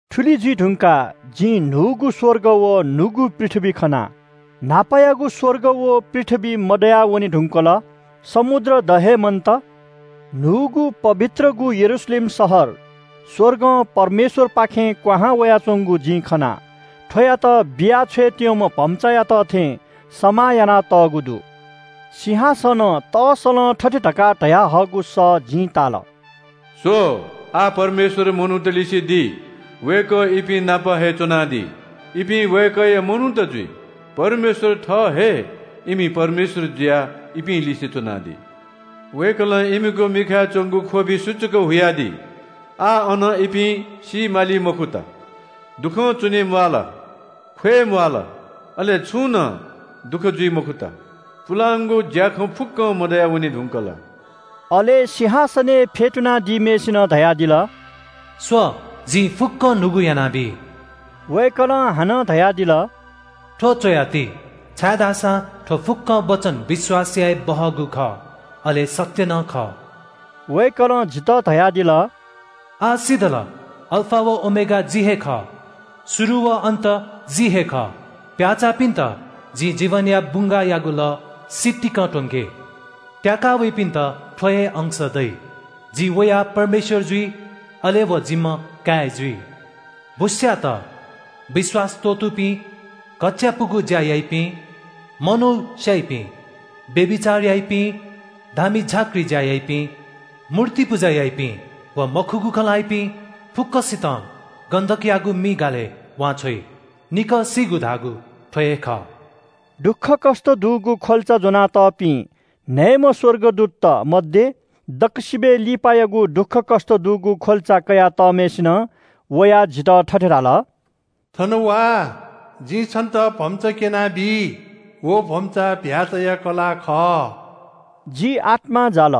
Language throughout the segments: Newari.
थुलि जुइ धुंकाः जिं न्‍हूगु स्‍वर्ग व न्‍हूगु पृथ्‍वी खना। न्‍हापायागु स्‍वर्ग व पृथ्‍वी मदयावने धुंकल। समुद्र द हे मन्‍त। न्‍हूगु पवित्रगु यरूशलेम शहर स्‍वर्गं परमेश्‍वरपाखें क्‍वहां वयाच्‍वंगु जिं खना। थ्‍वयात बिया छ्वयेत्‍यंम्‍ह भम्‍चायात थें समाः यानातःगु दु। सिंहासनं तःसलं थथे धकाः धयाहःगु सः जिं ताल – “स्‍व, आः परमेश्‍वर मनूतलिसे दी। वय्‌कः इपिं नाप हे च्‍वनादी। इपिं वय्‌कःया मनूत जुइ। परमेश्‍वर थः हे इमि परमेश्‍वर जुयाः इपिं लिसे च्‍वनादी। वय्‌कलं इमिगु मिखाय् च्‍वंगु ख्‍वबि सुचुक हुयादी। आः अन इपिं सी माली मखुत, दुःखं च्‍वने म्‍वाःल, ख्‍वय् म्‍वाःल, अले छुं नं दुःख जुइ मखुत। पुलांगु ज्‍याखँ फुक्‍कं मदयावने धुंकल।” अले सिंहासनय् फ्‍यतुनादीम्‍हय्‌सिनं धयादिल – “स्‍व, जिं फुक्‍कं न्‍हूगु यानाबी।” वय्‌कलं हानं धयादिल – “थ्‍व च्‍वयाति, छाय्‌धाःसा थ्‍व फुक्‍क वचन विश्‍वास याये बहःगु खः, अले सत्‍य नं खः।” वय्‌कलं जितः धयादिल – “आः सिधल। अल्‍फा व ओमेगा जि हे खः। शुरु व अन्‍त जि हे खः। प्‍याचाःपिन्‍त जिं जीवनया बुंगाःयागु लः सितिकं त्‍वंके। त्‍याकावइपिन्‍त थ्‍व हे अंश दइ। जि वया परमेश्‍वर जुइ, अले व जिम्‍ह काय् जुइ। “भुस्‍याःत, विश्‍वास त्‍वःतूपिं, घच्‍चायापुगु ज्‍या याइपिं, मनू स्‍याइपिं, व्‍यभिचार याइपिं, धामी झाँक्री ज्‍या याइपिं, मूर्ति पुजा याइपिं व मखुगु खँ ल्‍हाइपिं फुक्‍कसितं गन्‍धकयागु मि गालय् वांछ्वइ। निकः सीगु धाःगु थ्‍व हे खः।” दुःखकष्‍ट दुगु ख्‍वल्‍चा ज्‍वनातःपिं न्‍हय्‌म्‍ह स्‍वर्गदूतत मध्‍ये दक्‍वसिबय् लिपायागु दुःखकष्‍ट दुगु ख्‍वल्‍चा कयातःम्‍हय्‌सिनं वयाः जितः थथे धाल – “थन वा, जिं छन्‍त भम्‍चा क्‍यनाबी। व भम्‍चा चीधिकःम्‍ह भ्‍याःचाया कलाः खः।” जि आत्‍मां जाल,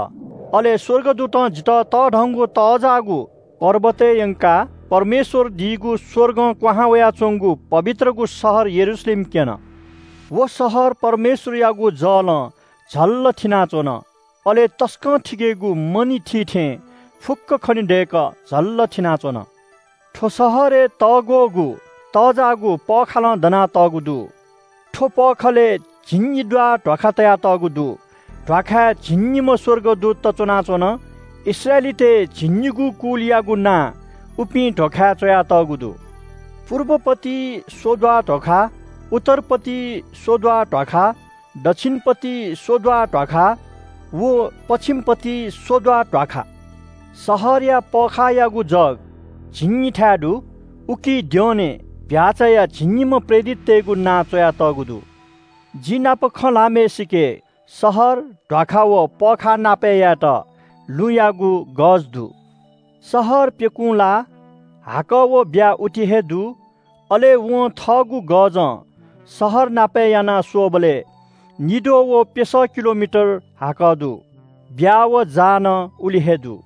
अले स्‍वर्गदूतं जितः तःधंगु तःजाःगु पर्वतय् यंकाः परमेश्‍वरदीगु स्‍वर्गं क्‍वहां वयाच्‍वंगु पवित्रगु शहर यरूशलेम क्‍यन। व शहर परमेश्‍वरयागु जलं झल्‍लल थिनाच्‍वन, अले तसकं थिकेगु मणि थी थें फुक्‍कं खनेदय्‌कः झल्‍लल थिनाच्‍वन। थ्‍व शहरय् तब्‍यागु व तःजाःगु पःखाः दनातःगु दु। थ्‍व पखालय् झिंनिद्वाः ध्‍वाखा तयातःगु दु। ध्‍वाखाय् झिंनिम्‍ह स्‍वर्गदूतत च्‍वनाच्‍वन। इस्राएलीतय् झिंनिगू कुलयागु नां उपिं ध्‍वाखाय् च्‍वयातःगु दु। पुर्ब पती स्‍वद्वाः ध्‍वाखा, उत्तर पती स्‍वद्वाः ध्‍वाखा, दच्‍छिन पती स्‍वद्वाः ध्‍वाखा व पच्‍छिम पती स्‍वद्वाः ध्‍वाखा। शहरया पःखाःयागु जग झिंनिथाय् दु। उकी द्यःने चीधिकःम्‍ह भ्‍याःचाया झिंनिम्‍ह प्रेरिततय्‌गु नां च्‍वयातःगु दु। जि नाप खँ ल्‍हाःम्‍हय्‌सिके शहर, ध्‍वाखा व पःखाः नापय् यायेत लुँयागु गज दु। शहर प्‍यकूं लाः। हाकः व ब्‍या उति हे दु। अले वं थःगु गजं शहर नापय् याना स्‍वःबलय् निद्वः व प्‍यसः किलोमिटर हाक दु। ब्‍या व जाः नं उलि हे दु।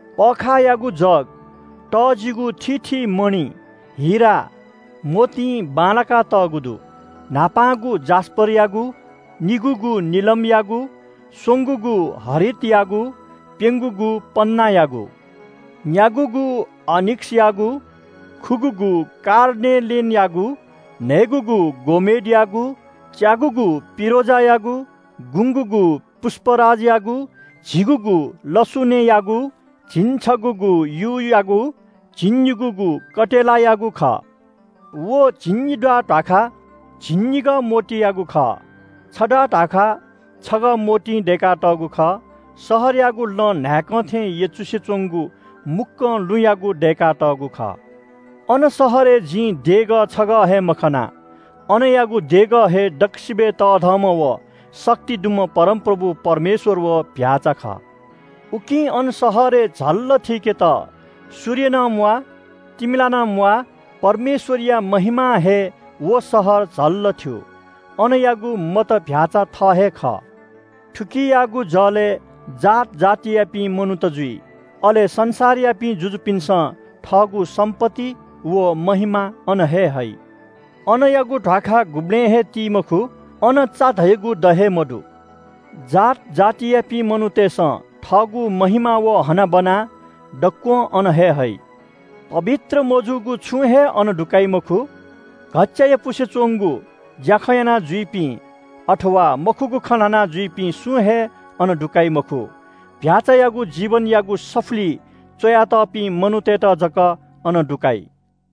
पःखाःयागु जग तःजिगु थीथी मणि, हिरा, मोतीं बांलाकातःगु दु। न्‍हापांगु जास्‍परयागु, निगूगु निलमयागु, स्‍वंगूगु हरितयागु, प्‍यंगूगु पन्‍नायागु, न्‍यागूगु आनिक्‍सयागु, खुगूगु कार्नेलेनयागु, न्‍हय्‌गूगु गोमेडयागु, च्‍यागूगु पिरोजायागु, गुंगूगु पुष्‍पराजयागु, झिगूगु लसुनेयागु, झिंछगूगु यूयागु, झिंनिगूगु कटेलायागु खः। व झिंनिद्वाः ध्‍वाखा झिंनिगः मोतीयागु खः। छद्वाः ध्‍वाखा छगः मोतीं दय्‌कातःगु खः। शहरयागु लँ न्‍हाय्‌कं थें यचुसे च्‍वंगु मुक्‍कं लुँयागु दय्‌कातःगु खः। अन शहरय् जिं देगः छगः हे मखना। अनयागु देगः हे दक्‍व शक्ति दुम्‍ह परमप्रभु परमेश्‍वर व चीधिकःम्‍ह भ्‍याःचा खः। उकिं अन शहरय् झल्‍लल थीकेत सूर्य नं म्‍वाः तिमिला नं म्‍वाः। परमेश्‍वरया महिमां हे व शहर झल्‍लल थ्‍यू। अनयागु मत चीधिकःम्‍ह भ्‍याःचा थः हे खः। थुकियागु जलय् जात जातियापिं मनूत जुइ। अले संसारयापिं जुजुपिन्‍सं थःगु सम्‍पत्ति व महिमा अन हे हइ। अनयागु ध्‍वाखा गुबलें हे ति मखु। अन चा धयागु द हे मदु। जात जातियापिं मनूतय्‌सं थःगु महिमा व हनाबना दक्‍वं अन हे हइ। पवित्र मजूगु छुं हे अन दुकाइ मखु। घच्‍चायापुसे च्‍वंगु ज्‍याखँ यानाजुइपिं, अथवा मखुगु खँ ल्‍हानाजुइपिं सुं हे अन दुकाइ मखु। भ्‍याःचायागु जीवनयागु सफुलिइ च्‍वयातःपिं मनूतय्‌त जक अन दुकाइ।